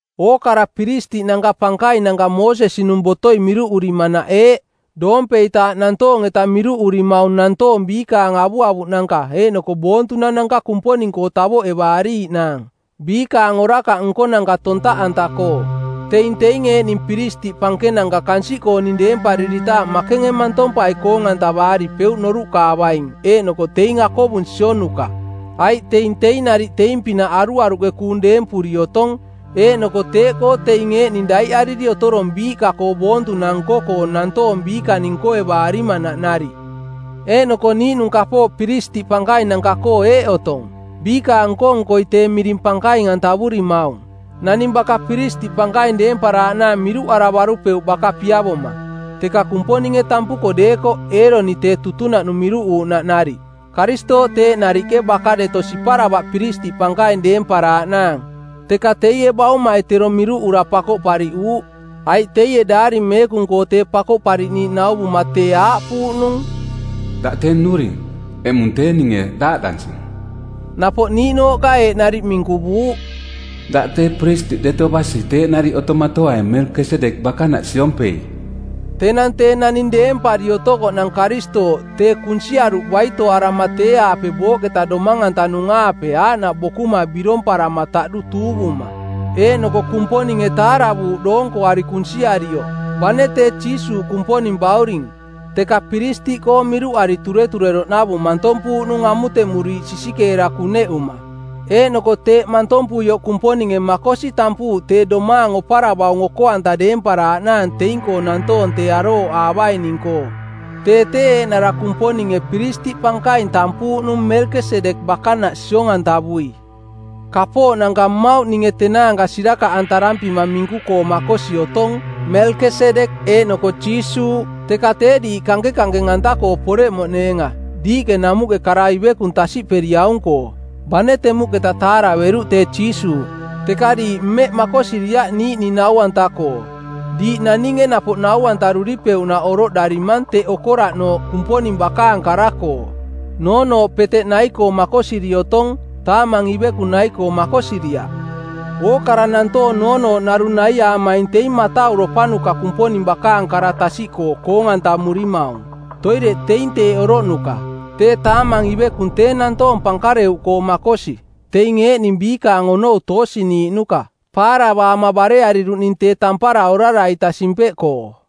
Ookara piristiꞌnanka pankainanka Moosesi-nung botoi miruꞌurimanaꞌ eeꞌ: Doompeitaaꞌ nantoong-eta miruꞌurimaung nantoong biikaang avuavuꞌnanka eeꞌnoko boontunananka Kumponing-koo tavoꞌevaariiꞌnaang, biikaang orakaꞌ nkonanka tontaꞌanta-koo. Teing teing eeꞌning piristiꞌ pankenanka kansiꞌkooning deempariritaaꞌ makenge mantompai koong-antavaaripeuꞌ noruꞌkaavaing eeꞌnoko teing akovung sionuka, aiꞌ teing teing nariꞌ teing-pinaꞌ aruaruꞌke kuung deempuri otong. Eeꞌnoko teeꞌkoo teing eeꞌning daiꞌariri otorong biiꞌka-koo boontunang nko-koo nantoong biikaning nkoevaarimanaꞌ nariꞌ. Eeꞌnoko niiꞌnung kapooꞌ piristiꞌ pankainanka-koo eeꞌ otong: Biikaang nko-nkoi tee miring pankaing-antavurimaung. Naning baka piristiꞌ pankaing deemparaaꞌnaang miruꞌaravarupeuꞌ baka piavoma, teka Kumponinge tampuko deekoꞌ Eeroni tee tutunaꞌnung miruꞌuuꞌnaꞌ nariꞌ. Karistooꞌ teeꞌ nariꞌke baka deto siparavaꞌ piristiꞌ pankaing deemparaaꞌnaang, teka teie Baumai tero miruꞌura pakoꞌpariꞌuuꞌ. Aiꞌ teie Daari Meekung-koo Tee Pakoꞌpariꞌniiꞌ nauvuma tee aaꞌpuuꞌnung, “Daꞌ tee nnuring, eꞌmung tee ninge daaꞌdansing.” Napoꞌ niiꞌnooꞌka eeꞌ nariꞌ minkuvuuꞌ, “Daꞌ tee piristiꞌ deto basi teeꞌ nariꞌ otomatoaing Melkesedek bakanaꞌ siompei.” Tenang tee naning deempari otokoꞌnang Karistooꞌ tee kunsiaruꞌ baitoarama tee-aape booꞌketa domang-antanung-aape aaꞌnaꞌ bokuma biromparama taꞌdu tuuvuma. Eeꞌnoko Kumponinge taaravuuꞌ doonkoari kunsiarioꞌ. Bane tee Jiisuuꞌ Kumponing Bauring, teka piristiꞌkoo miruꞌari turetureroꞌnavung mantompuuꞌnung amutemuriiꞌ sisikeera kuneꞌuma. Eeꞌnoko teeꞌ mantompuioꞌ Kumponinge makosi tampuuꞌ tee domaang oparavaung oko-anta deemparaaꞌnaang teing-koo nantoong tee arooꞌaavaining-koo. Tee tee eeꞌnara Kumponinge piristiꞌ pankaing tampuuꞌnung Melkesedek bakanaꞌ siong-antavui. Kapooꞌnanka mmauꞌ ninge tenaanka sirakaꞌantarampima minku-koo makosi otong, Melkesedek eeꞌnoko Jiisuuꞌ, teka tee diiꞌ kankenkankeng-anta-koo poreꞌmoꞌneenga, diiꞌke namuꞌke kara ivekung tasiꞌperiaung-koo. Bane temuꞌketa taaraveruꞌ tee Jiisuuꞌ, teka diiꞌ mmeꞌ makosiriaꞌ niiꞌning nau-anta-koo. Diiꞌ naninge napoꞌ nau-antaruripeuꞌnaꞌ oroꞌdarimang teꞌ okoraꞌnooꞌ Kumponing bakaang kara-koo. Noonooꞌ peteꞌ nai-koo makosiri otong, taamang ivekung nai-koo makosiriaꞌ. Ookara nantoong noonooꞌ narung naiaamaing teing matauropanuka Kumponing bakaang kara tasiꞌkoo koong-antamurimaung. Toireꞌ teing teeꞌ oroꞌnuka. Tee taamang ivekung tee nantoong pankareuꞌkoo makosi, teing eeꞌning biikaang onou toosiniiꞌnuka, paaravaama bareariruꞌning tee tampara orara-ita simpeꞌkoo.